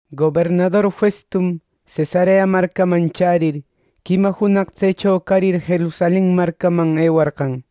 Gobernador Festum, Cesarea marcaman chärir, quima junaq tsecho carir Jerusalenman ewarqan.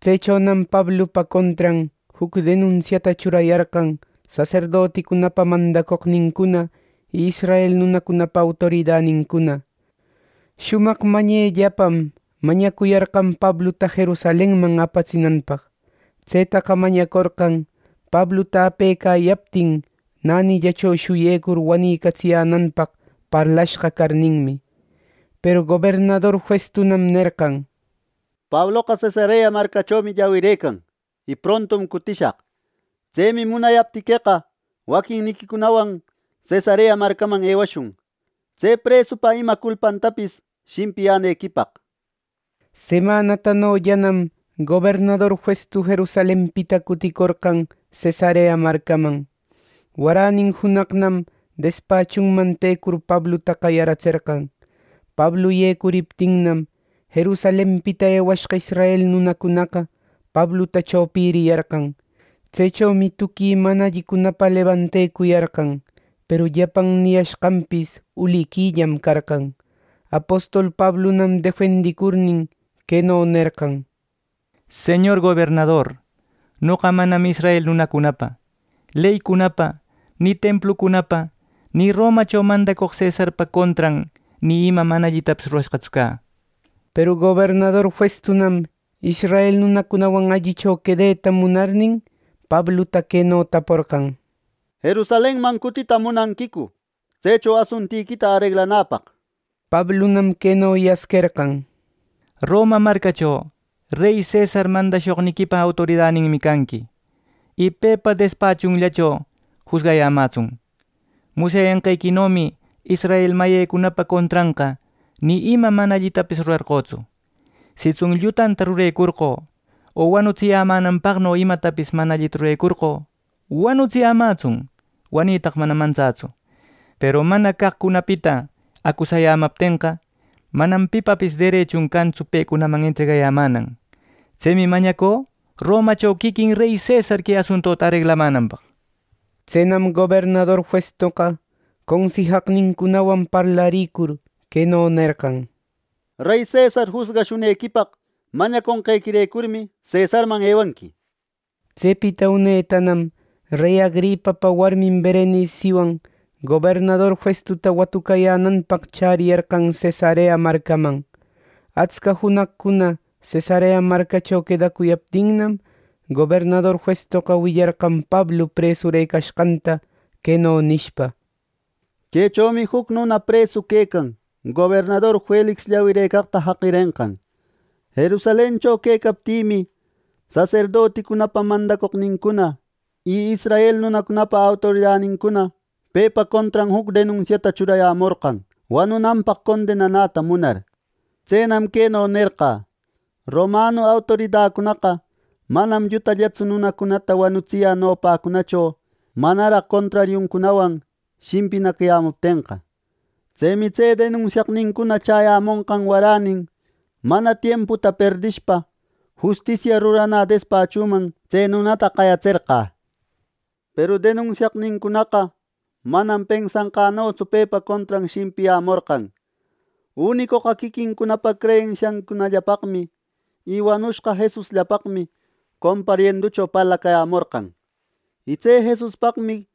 Tsechonam Pablupa contran juc denunsiata churayarqan saserdoticunapa mandacoqnincuna y israel nunacunapa autoridanincuna. Shumaq mañellapam mañacuyarqan Pabluta Jerusalenman apatsinanpaq. Tsetaqa mañacorqan Pabluta apecayaptin nänillacho shuyecur wanïcatsiyänanpaq parlashqa carninmi. Peru gobernador Festunam nerqan: —Pabloqa Cesarea marcachomi llawirëcan, y prontum cutishaq. Tsemi munayaptiqueqa, waquinniquicunawan Cesarea marcaman ewashun, tse presupa ima culpantapis shimpiyänequipaq —nishpa. Semanatanollanam gobernador Festu Jerusalenpita cuticorqan Cesarea marcaman. Waränin junaqnam despachunman tecur Pabluta qayaratserqan. Pablu yecuriptinnam, Jerusalenpita ewashqa israel nunacunaqa Pabluta chopiriyarqan. Tsechomi tuqui mana allicunapa lebantecuyarqan. Peru llapan niyashqanpis uliquillam carqan. Apostol Pablunam defendicurnin, queno nerqan: —Señor gobernador, noqa manam israel nunacunapa leycunapa, ni templucunapa, ni Romacho mandacoq cesarpa contran, ni ima mana allitapis rurashqatsu cä —nir. Peru gobernador Festunam israel nunacunawan allicho quedeta munarnin, Pabluta queno taporqan: —¿Jerusalenman cutita munanquicu tsecho asuntiquita areglanäpaq? —nishpa. Pablunam queno yasquerqan: —Roma marcacho rey cesar mandashoqniquipa autoridaninmi canqui; y pepa despachunllacho jusgayämätsun. Musyanqequinomi israel mayicunapa contranqa ni ima mana allitapis rurarqötsu. Sitsun llutanta rurecorqö o wanutsiyämänanpaqno imatapis mana allita rurecorqö, wanutsiyämätsun. Wanitaqa manam mantsätsu. Peru mana caqcunapita acusecayamaptenqa, manam pipapis derechun cantsu pecunaman entregayämänan. Tsemi mañacü Romacho quiquin rey cesar que asuntuta areglamänanpaq. Tsenam gobernador Festoqa consijaqnincunawan parlarïcur queno nerqan: —Rey cesar jusgashunequipaq mañaconqequirecurmi, cesarman ewanqui —nir. Tsepita unetanam rey Agripapa warmin Bereniciwan gobernador Festuta watucayänäpaq chäriyarqan Cesarea marcaman. Atsca junaqcuna Cesarea marcacho quedacuyaptinnam, gobernador Festoqa willarqan Pablu presurëcashqanta queno nishpa: —Quechomi juc nuna presu quecan gobernador Felix llawirëcaqta jaqirenqan. Jerusalencho quecaptimi, saserdoticunapa mandacoqnincuna, y israel nunacunapa autoridanincuna pepa contran juc denunsiata churayämorqan, wanunanpaq condenanäta munar. Tsenam queno nerqä: Romanu autoridacunaqa manam llutallatsu nunata wanutsiyä nopäcunacho manaraq contrariuncunawan shimpinacayämuptenqa. Tsemi tse denunsiaqnincuna chäyämonqan warenin, mana tiemputa perdishpa, justisia ruranä despachuman tse nunata qayatserqä. Peru denunsiaqnincunaqa manam pensanqänotsu pepa contran shimpiyämorqan. Unicoqa quiquincunapa creyensiancunallapaqmi y wanushqa Jesusllapaqmi comparienducho parlacäyamorqan. Y tse Jesuspaqmi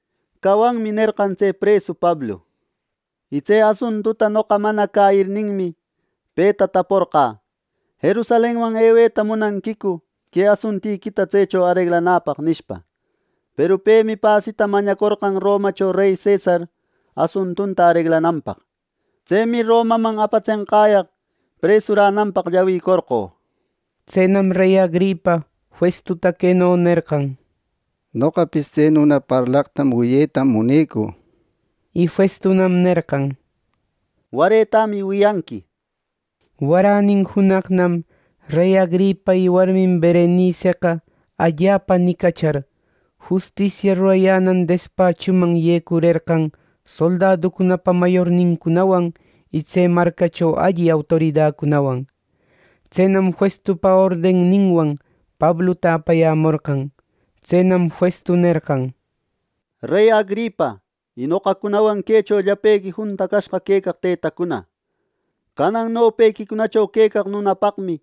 ‘Cawanmi’ nerqan tse presu Pablu. Y tse asuntuta noqa mana cäyirninmi, peta taporqä: ‘¿Jerusalenman eweta munanquicu que asuntiquita tsecho areglanapaq?’ nishpa. Peru pemi pasita mañacorqan Romacho rey cesar asuntunta areglananpaq. Tsemi Romaman apatsenqäyaq presurananpaq llawicorqö. Tsenam rey Agripa Festuta queno nerqan: —Noqapis tse nuna parlaqta wiyetam munecü —nishpa. Y Festunam nerqan: —Waretämi wiyanqui —nishpa. Waränin junaqnam rey Agripa y warmin Bereniceqa allapa nicachar, justisia rurayänan despachuman yecurerqan soldaducunapa mayornincunawan y tse marcacho alli autoridacunawan. Tsenam Festupa ordenninwan Pabluta aparayämorqan. Tsenam Festu nerqan: —Rey Agripa y noqacunawan quecho llapequi juntacashqa quecaq tëtacuna: Canan nopequicunacho quecaq nunapaqmi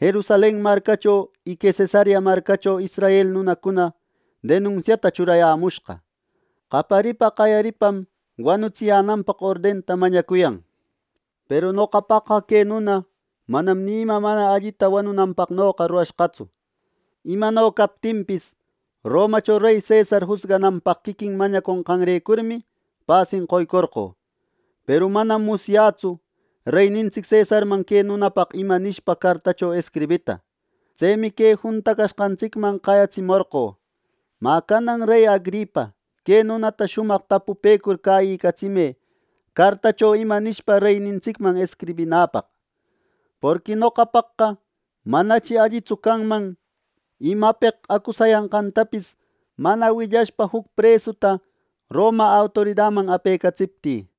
Jerusalen marcacho y que Cesarea marcacho israel nunacuna denunsiata churayämushqa. Qayaripa qaparipam wanutsiyänanpaq ordenta mañacuyan. Peru noqapaqqa que nuna manam ni ima mana allita wanunanpaqnoqa rurashqatsu. Imano captinpis, Romacho rey cesar jusgananpaq quiquin mañaconqanrecurmi pasin qoycorqö. Peru manam musyätsu reynintsic cesarman que nunapaq ima nishpa cartacho escribita. Tsemi que juntacashqantsicman qayatsimorqö. Mä canan rey Agripa que nunata shumaq tapupëcur cäyicatsimë cartacho ima nishpa reyninsticman escribinäpaq. Porqui noqapaqqa manachi allitsu canman imapeq acusayashqantapis mana willashpa juc presuta Roma autoridaman apecatsiptï.